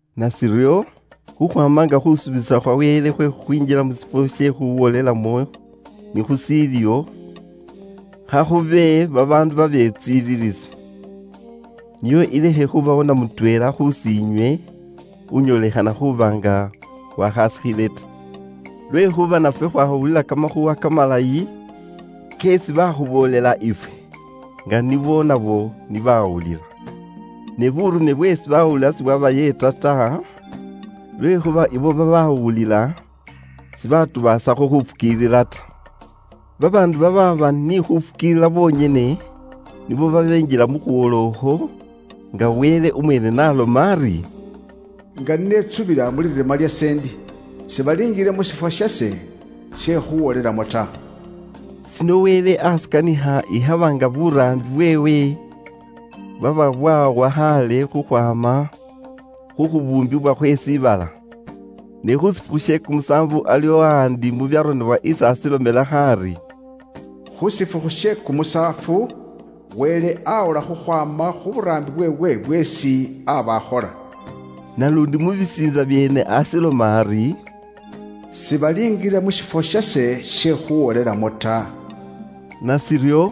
Nashiryo, khukhwaama nga khusuubisa khwa Wele khwe khukhwinjila mu shifwo she khuwolelamo ni khushiliwo, khakhube babaandu babetsililisi, nio ilekhe khubawo na mutweela khus'inywe unyoolekhana khuuba nga waakhaasikhile ta. Lwekhuuba nafwe khwawulila kamakhuuwa kamalayi keesi baakhuboolela ifwe, nga nibo nabo ni baawulila. Ne buurume bweesi baawulila sibwabayeeta ta, lwekhuuba ibo babaawulila sibatubaasakho khufukiilila ta. Babaandu babaaba ni khufukiilila bonyene nibo babenjila mu khuwola ukhwo, nga Wele umweene n'aloma ari, “Nga ni netsubila mu lirima lyase ndi, ‘Sibalinjila mu shifwo shase she khuwolelamo ta.’” Shino Wele ashikanikha ikhaba nga buraambi bweewe bwaba bwaawa khaale khukhwaama khu khubuumbibwa khwe shiibala. Ni khu shifukhu she kumusaafu iliwo ahaandi mu byaronebwa isi ashilomelakho ari: “Khu shifukhu she kumusaafu, Wele aawola khukhwaama khu buraambi bweewe bweesi aaba akhola.” Naluundi mu bisiintsa byeene ashiloma ari, “Sibalinjila mu shifwo shase she khuuwolelamo ta.” Nashiryo,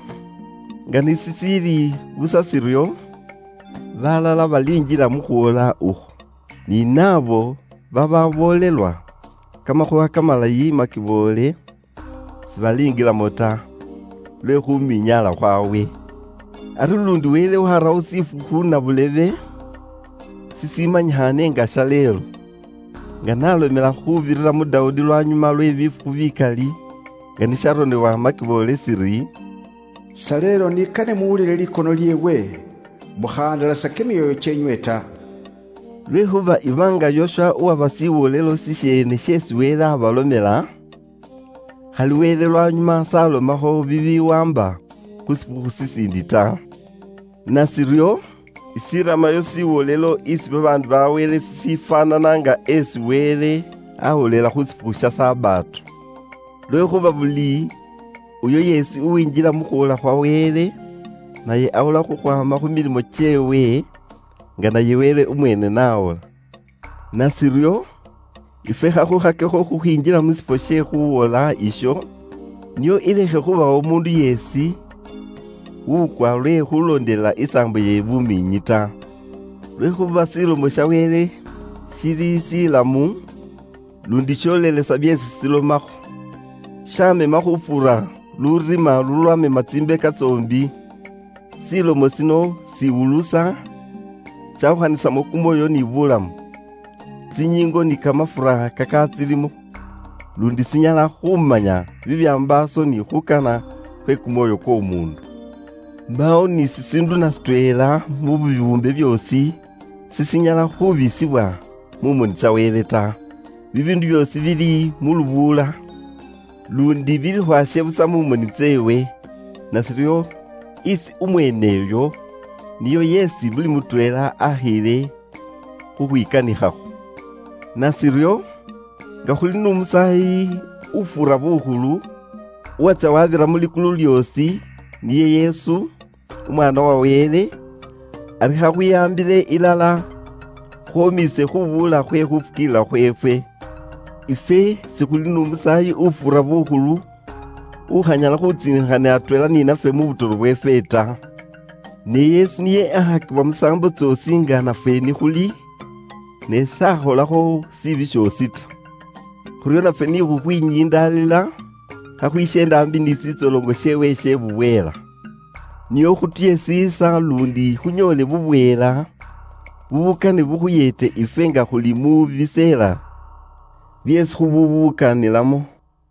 nga ni shishiili busa shiryo, baalala balinjila mu khuwola ukhwo. Ni naabo babaaboolelwa kamakhuuwa kamalayi makiboole sibalinjilamo ta, lwe khuminyaala khwawe. Ari luundi Wele warawo shifukhu nabulebe shishimanyikhaane nga “Shaleelo,” nga n'alomela khuubirira mu Dawudi lwanyuma lwe bifukhu bikali nga ni sharonebwa makiboole shiri, “Shaleelo ni kane muwulile likono lyeewe, mukhahandalasa kimyoyo kyeenywe ta.” Lwekhuuba iba nga Yoswa uwabawa shiwolelo shisheene sheesi Wele abalomela, khali Wele lwanyuma s'alomakho bibiwaamba khu shifukhu shishiindi ta. Nashiryo, ishiramayo shiwolelo isi babaandu ba Wele shishifwaanana nga esi Wele awolela khu shifukhu sha Sabato. Lwekhuuba buli uyo yeesi uwinjila mu khuwola khwa Wele, naye awola khukhwaama khu milimo kyeewe, nga naye Wele umweene n'awola. Nashiryo, ifwe khakhukhakekho khukhwinjila mu shifwo she khuuwola isho, nio ilekhe khubawo umuundu yeesi wukwa lwe khulondelela isaambo ye bumiinyi ta. Lwekhuuba Ilomo ya Wele ili inamu, luundi yolelesa byeesi ilomakho. Yaamema khuufuura lurima lulwamema tsimbeka tsoombi. Ilomo yino iwulusa, yaawukhanisamo kumwoyo ni bulamu, tsinyiingo ni kamafura kakaatsilimo, luundi inyala khuumanya bibyambaaso ni khuukana khwe kumwoyo kw'omuundu. Mbaawo ni shishiindu na shitweela mu bibuumbe byoosi shishinyala khubisibwa mu moni tsa Wele ta. Bibiindu byoosi bili mu lubuula, luundi bili khwasye busa mu moni tseewe. Nashiryo, isi umweeneyo niyo yeesi buli mutweela akhiile khukhwikanikhakho. Nashiryo, nga ni khuli n'Umusaayi ufuura bukhulu, uwatsya wabira mu likulu lyoosi, niye Yesu, Umwaana wa Wele, ari khakhwihaambile ilala, khwomiise khubuula khwe khufukiilila khweefwe. Ifwe khuli n'Umusaayi ufuura bukhulu utsiinikhila atweela ni nafwe mu butoro bweefwe. Ne Yesu niye akhakibwa musaambo tsoosi nga nafwe ni khuli, ne niye s'akholakho shishonako shoosi ta. Khuryo nafwe ni khukhwinyindaalila, khakhwisyeende aambi ni shitsoloŋo sheewe she bubweela, nio khutuye shiisa luundi khunyoole bubweela bubukane bukhuyeete ifwe nga khuli mu biseela byeesi khubukanilamo.